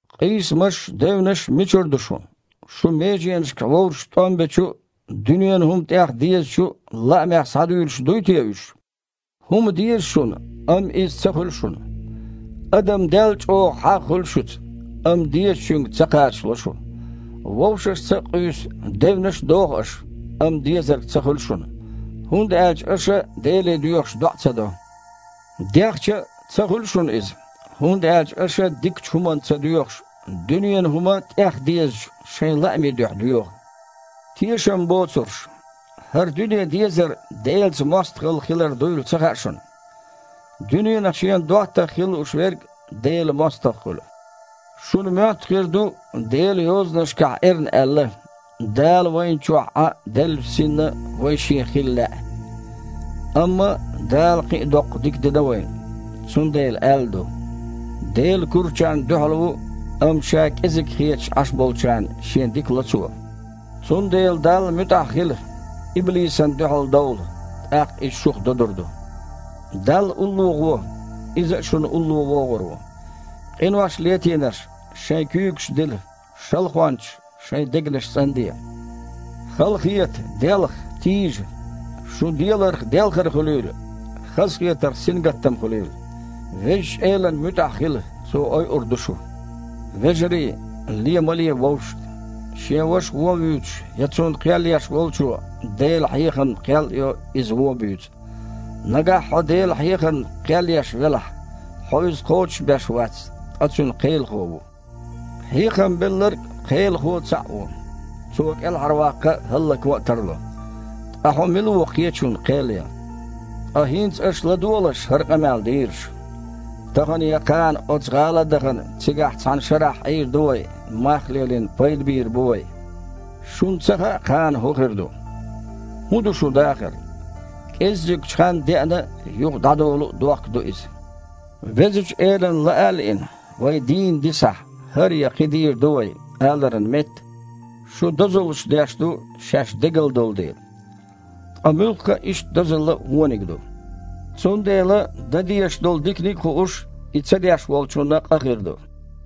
Къийсамаш а, девнаш а мичара ду шун? Шун меженашкахь вовшашца тІом бечу а, дуьненан хІума тІех дезачу а лаамех схьадуьйлуш дуй те уьш? ХІума деза шуна, амма иза ца хуьлу шуна. Адам дел чІогІа хьагІ хуьлу шуьца, амма дезачуьнга ца кхачало шу. Вовшашца а къуьйсу, девнаш а доху аша, амма дезарг ца хуьлу шуна, хІунда аьлча аша, Деле доьхуш, доІа ца до. Дехча а, ца хуьлу шуна иза, хІунда аьлча аша дикачу хІуманна ца доьхуш, дуьненан хІума тІех дезачу шайн лаамийн дуьхьа доьху. Тешам боцурш! ХІара дуьне дезар Делаца мостагІалла хилар дуйла ца хаьа шуна? Дуьненах шена доттагІа хила лууш верг Делан мостагІа хуьлу. Шуна моьтту хир ду Делан Йозанашкахь эрна аьлла: «Дала вайна чохь Іан деллачу Синна вай Шен хила лаьа»? Амма Дала кхин а доккха дика дина вайна. Цундела аьлла ду: «Дела курачарна дуьхьал ву, амма ша кІезиг хеташ Іаш болчарна Шен дика ло Цо». Цундела Далла муьтІахь хила, иблисана дуьхьалдовла, тІаккха иза шух додур ду. Далла улло гІо, Иза а шуна улло вогІур ву. Къинош летийнарш, шайн куьйгаш дила, шалхончаш, шайн дегнаш цІанде. Халахета, делха, тийжа. Шун деларх делхар хуьлийла, хазахетарх сингаттам хуьлийла. Везачу Элана муьтІахь хила, Цо ойур ду шу. Вежарий, лен ма ле вовшашна. Шен ваша вон вуьйцуш, я цунна кхел еш волчо Делан хьехамна кхел а йо, иза вон а буьйцу. Нагахь хьо Делан хьехамна кхел еш велахь, хьо иза кхочушбеш вац, ткъа цуьнан кхелахо ву. Хьехам Белларг а, Кхелахо а цхьаъ ву, Цо кІелхьарваккха а, хІаллакван а тарло. Ткъа хьо мила ву кхечунна кхел ян? Ткъа хІинца аша ладогІалаш, хІара къамел дийраш: «Тахана я кхана оцу гІала а дахана, цигахь цхьана шарахь Іийр ду вай, мах а лелийна, пайда бийр бу вай». Шуна ца хаьа, кхана хІун хир ду. ХІун ду шун дахар? КІеззигчу ханна деана а, юха дІадолу а дохк ду иза. «Везачу Элана лаа а лиъна, вай дийна дисахь, хІара я кхин дийр ду вай», – аларан метта, шу дозаллаш деш ду, шаьш дегала долу дела. Ткъа муьлхха а иштта дозалла вониг ду. Цундела, дан дезаш долу диканиг а хууш, и ца деш волчунна къа хир ду.